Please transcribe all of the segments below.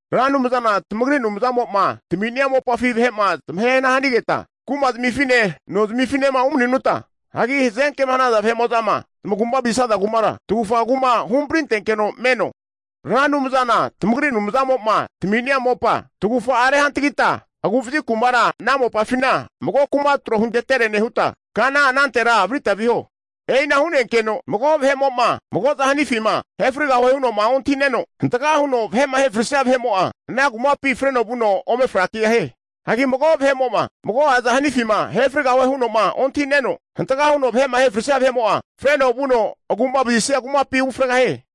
Ra Anumzana tamagri Anumzamo'ma tami'nia mopafi vahe'ma zamahehana hanigetma kuma'zmifine nozmifinema umani'nuta, hazenkema hanaza vahe'mo'zama zamagu'ma vazisaza kumara tagufa kuma huhamprintenkeno meno. Ra Anumzana tamagri Anumzamo'ma tami'nia mopa tagufa'afi rehantagitma, agu'vazi kumara ana mopafina mago kuma tro huntetere nehuta, kana anantera varita viho. E'i ana hu'nenkeno, mago vahe'mo'ma mago'azama hanifima ahefrigahue huno'ma ontahi'neno hantga huno vahe'ma ahefrisia vahe'mo'a, ana kumapi freno vuno ome frakigahie. Hagi mago vahe'mo'ma mago'azama hanifima ahefrigahue huno'ma ontahi'neno hantga huno vahe'ma ahefrisia vahe'mo'a, freno vuno agu'mavazisia kumapi ufregahie.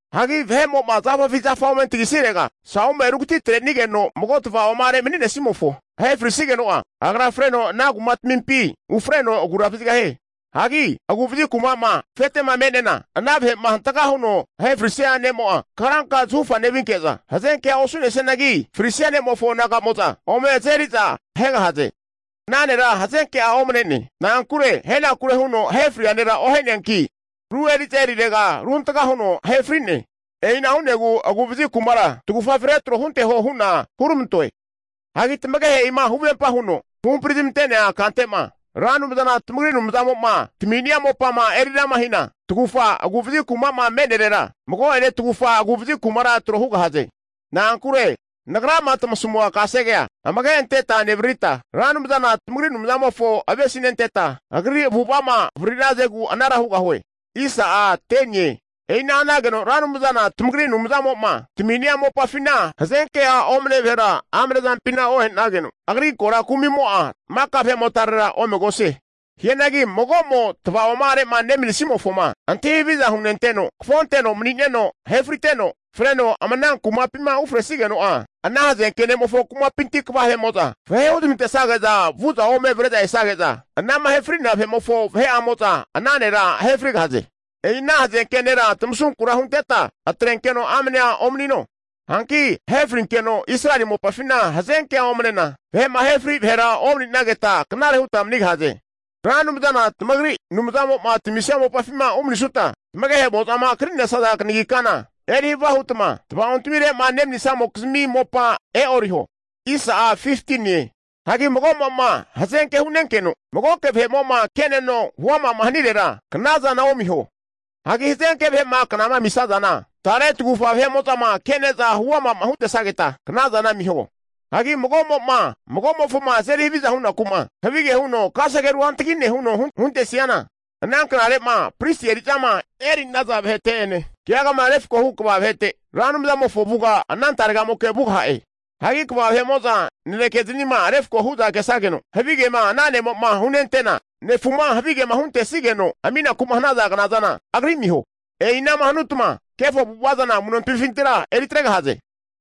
Hagi vahe'mo'ma zafafi zafa ome antagisirega sau'me rugatitre'nigeno mago tavaoma'are maninesimofo ahe frisigeno'a, agra freno ana kumatmimpi ufreno agura vazigahie. Hagi agu'vazi kuma'ma afetema me'nena, ana vahe'ma hantga huno ahefrisia ne'mo'a, karanka zahufa nevinke'za hazenkea osu'nesianagi frisia ne'mofo naga'amo'za ome azeri'za ahegahaze. Ana nera hazenke'a omne'ne. Na'ankure ahenakure huno ahefria nera ohe'neanki, ru eri'za erirega ruhantga huno ahefri'ne. E'ina hu'negu agu'vazi kumara tagufafi retro hunteho hu'na huramantoe. Hagi tamagehe'ima huvempa huno huhampri zamante'nea kante'ma Ra Anumzana tamagri Anumzamo'ma tami'nia mopama erirama hina, tagufa agu'vazi kuma'ma me'nerera mago'ene tagufa agu'vazi kuma tro hugahaze. Na'ankure nagrama tamasamua kasegea amage anteta nevaririta, Ra Anumzana tamagri Anumzamofo avesinenteta, Agri avu'ava'ma avariri'nazagu anara hugahie. E'ina hanageno Ra Anumzana tamagri Anumzamo'ma tami'nia mopafina hazenke'a omne vahera amane zampina ohe'nageno, agri korankumi'mo'a maka vahe'motarera omegosie. Hianagi mago'mo tava'oma'are'ma nemanisimofoma antahi haviza hunenteno, kafonteno mani'neno ahefriteno freno ama ana kumapima ufresigeno'a, ana hazenke ne'mofo kumapinti kva vahe'mo'za vahe huzmantesage'za vu'za ome avre'za esage'za, anama ahe fri'nea vahe'mofo vahe'amo'za ana nera ahefrigahaze. E'i ana hazenke nera tamasunkura hunteta atrenkeno amanea omanino. Hanki ahe frinkeno Israeli mopafina hazenkea omnena, vahe'ma ahefri vahera omani'nageta knare hutma manigahaze. Ra Anumzana tamagri Anumzamo'ma tamisia mopafima umanisutma, tamagehe'mozama kri'nesaza kanagi kana eri havia huta tava'ontmire'ma nemanisamokizmi mopa e'oriho. Hagi mago'mo'ma hazenke hu'nenkeno magoke vahe'mo'ma ke'neno, huama hanirera knazana omiho. Hagi hazenke vahe'ma knama amisazana, tare tagufa vahe'mo'zama ke'ne'za huama'ma huntesageta, knazana amiho. Hagi mago'mo'ma, magomofoma azeri haviza hunaku'ma, havige huno kasege ru hantgi'ne huno huntesiana, ana knare'ma pristi eri'zama eri'naza vahete'ene, keagama refko hu kva vahete Ra Anumzamofo avuga ana taregamoke vugaha'e. Hagi kva vahe'mo'za nanekeznima refko hu'za kesageno, havigema ana ne'ma hunentena, nefuma havigema huntesigeno aminaku'ma hanaza knazana, agri amiho. E'ina'ma hanutma kefo avu'ava zana amu'notmifintira eritregahaze.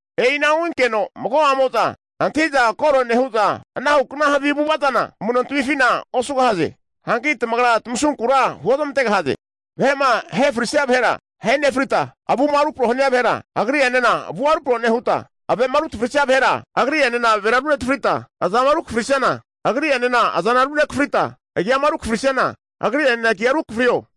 E'inahu hinkeno mago'amo'za antahi'za koro nehu'za, anahukna havi avu'ava zana amu'nontamifina osugahaze. Hanki tamagra tamasunkura huozmantegahaze. Vahe'ma ahe frisia vahera, ahe nefritma, avuma rupro'ma hania vahera, agri'enena avu rupro nehuta, ave'ma rutafrisia vahera, agri'enena avera runetafrita, azama rukafrisiana agri'enena aza runekafrita, agiama ru kafrisiana, agri'enena agia rukafriho.